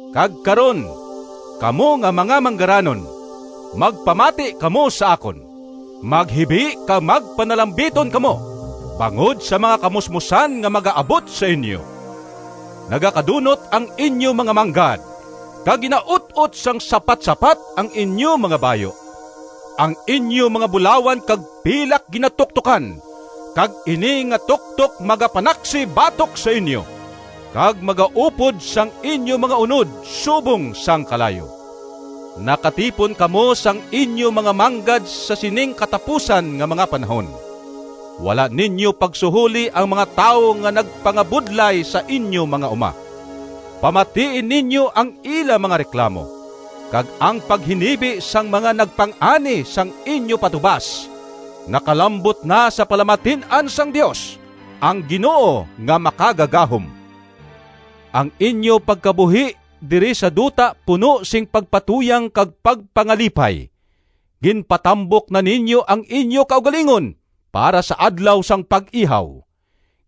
Kag karon, kamo nga mga manggaranon, magpamati kamo sa akon! Maghibi kag magpanalambiton kamo bangod sa mga kamusmosan nga magaabot sa inyo! Nagakadunot ang inyo mga manggad, kag ginaut-ot sang sapatsapat ang inyo mga bayu. Ang inyo mga bulawan kag pilak ginatuktokan, kag ini nga tuktok magapanaksi batok sa inyo, kag magaupod sang inyo mga unod subong sang kalayo. Nakatipon kamo sang inyo mga manggad sa sining katapusan nga mga panahon. Wala ninyo pagsuholi ang mga tawo nga nagpangabudlay sa inyo mga uma. Pamatii ninyo ang ila mga reklamo! Kag ang paghinibi sang mga nagpang-ani sang inyo patubas nakalambot na sa palamatin-an sang Dios, ang Ginoo nga Makagagahom! Ang inyo pagkabuhi diri sa duta puno sing pagpatuyang kag pagpangalipay. Ginpatambok na ninyo ang inyo kaugalingon para sa adlaw sang pag-ihaw.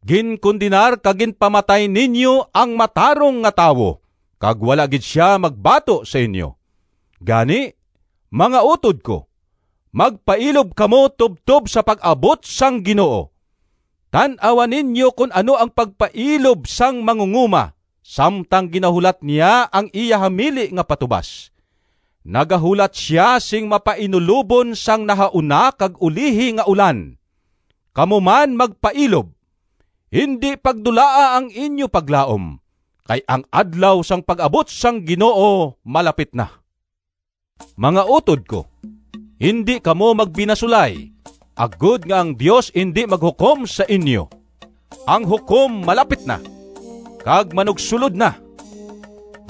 Ginkondenar kag ginpamatay ninyo ang matarong nga tawo kag wala gid sia magbato sa inyo. Gani, mga utod ko, magpailob kamo tubtob sa pag-abot sang Ginoo. Tan-awa ninyo kon ano ang pagpailob sang mangungoma samtang ginahulat niya ang iya hamili nga patubas. Nagahulat sia sing mapainulobon sang nahauna kag ulihi nga ulan. Kamo man magpailob. Indi pagdulaa ang inyo paglaom, kay ang adlaw sang pag-abot sang Ginoo malapit na. Mga utod ko, indi kamo magbinasulay, agod nga ang Dios indi maghukom sa inyo. Ang Hukom malapit na, kag manugsulod na!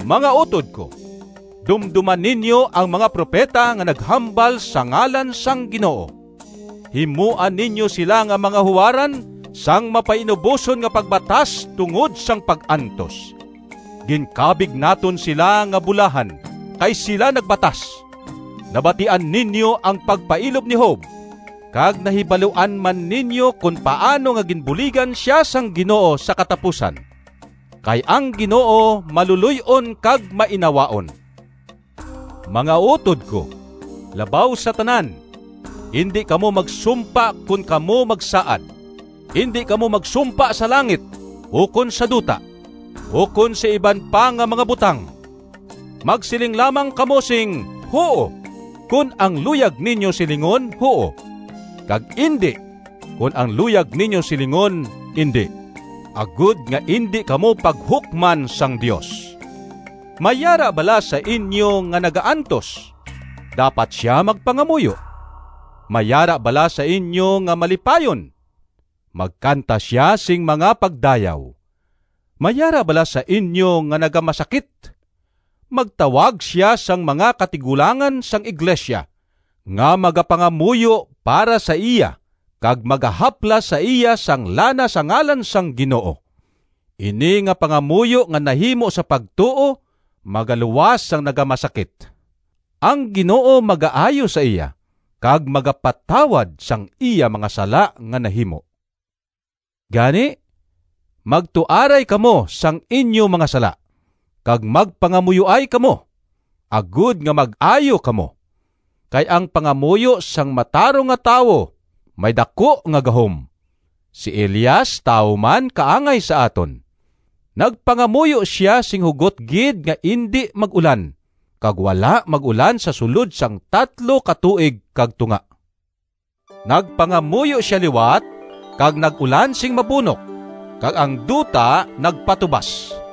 Mga utod ko, dumdoma ninyo ang mga propeta nga naghambal sa ngalan sang Ginoo. Himoa ninyo sila nga mga huwaran sang mapainuboson nga pagbatas tungod sang pag-antos. Ginkabig naton sila nga bulahan, kay sila nagbatas. Nabatian ninyo ang pagpailob ni Job, kag nahibaluan man ninyo kon paano nga ginbuligan sia sang Ginoo sa katapusan. Kay ang Ginoo maluloy-on kag mainawaon. Mga utod ko, labaw sa tanan, indi kamo magsumpa kon kamo magsaad. Indi kamo magsumpa sa langit, ukon sa duta, ukon sa iban pa nga mga butang. Magsiling lamang kamo sing “Huo” kon ang luyag ninyo silingon huo, kag “Indi” kon ang luyag ninyo silingon indi, agod nga indi kamo paghukman sang Dios. May yara bala sa inyo nga nagaantos? Dapat sia magpangamuyo. May yara bala sa inyo nga malipayon? Magkanta sia sing mga pagdayaw. May yara bala sa inyo nga nagamasakit? Magtawag sia sang mga katigulangan sang iglesia nga magapangamuyo para sa iya kag magahaplas sa iya sang lana sa ngalan sang Ginoo. Ini nga pangamuyo nga nahimo sa pagtuo magaluwas sang nagamasakit; ang Ginoo magaayo sa iya, kag magapatawad sang iya mga sala nga nahimo. Gani, magtuaray kamo sang inyo mga sala, kag magpangamuyoay kamo, agod nga mag-ayo kamo. Kay ang pangamuyo sang matarong nga tawo may daku nga gahom. Si Elias tawo man kaangay sa aton. Nagpangamuyo sia sing hugot gid nga indi mag-ulan, kag wala mag-ulan sa sulod sang tatlo ka tuig kag tunga. Nagpangamuyo sia liwat, kag nag-ulan sing mabunok kag ang duta nagpatubas.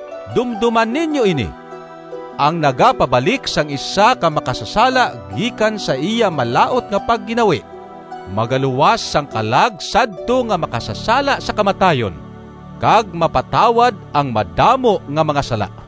dumdoma ninyo ini: ang nagapabalik sang isa ka makasasala gikan sa iya malaut nga pagginawi magaluwas sang kalag sadto nga makasasala sa kamatayon, kag mapatawad ang madamo nga mga sala.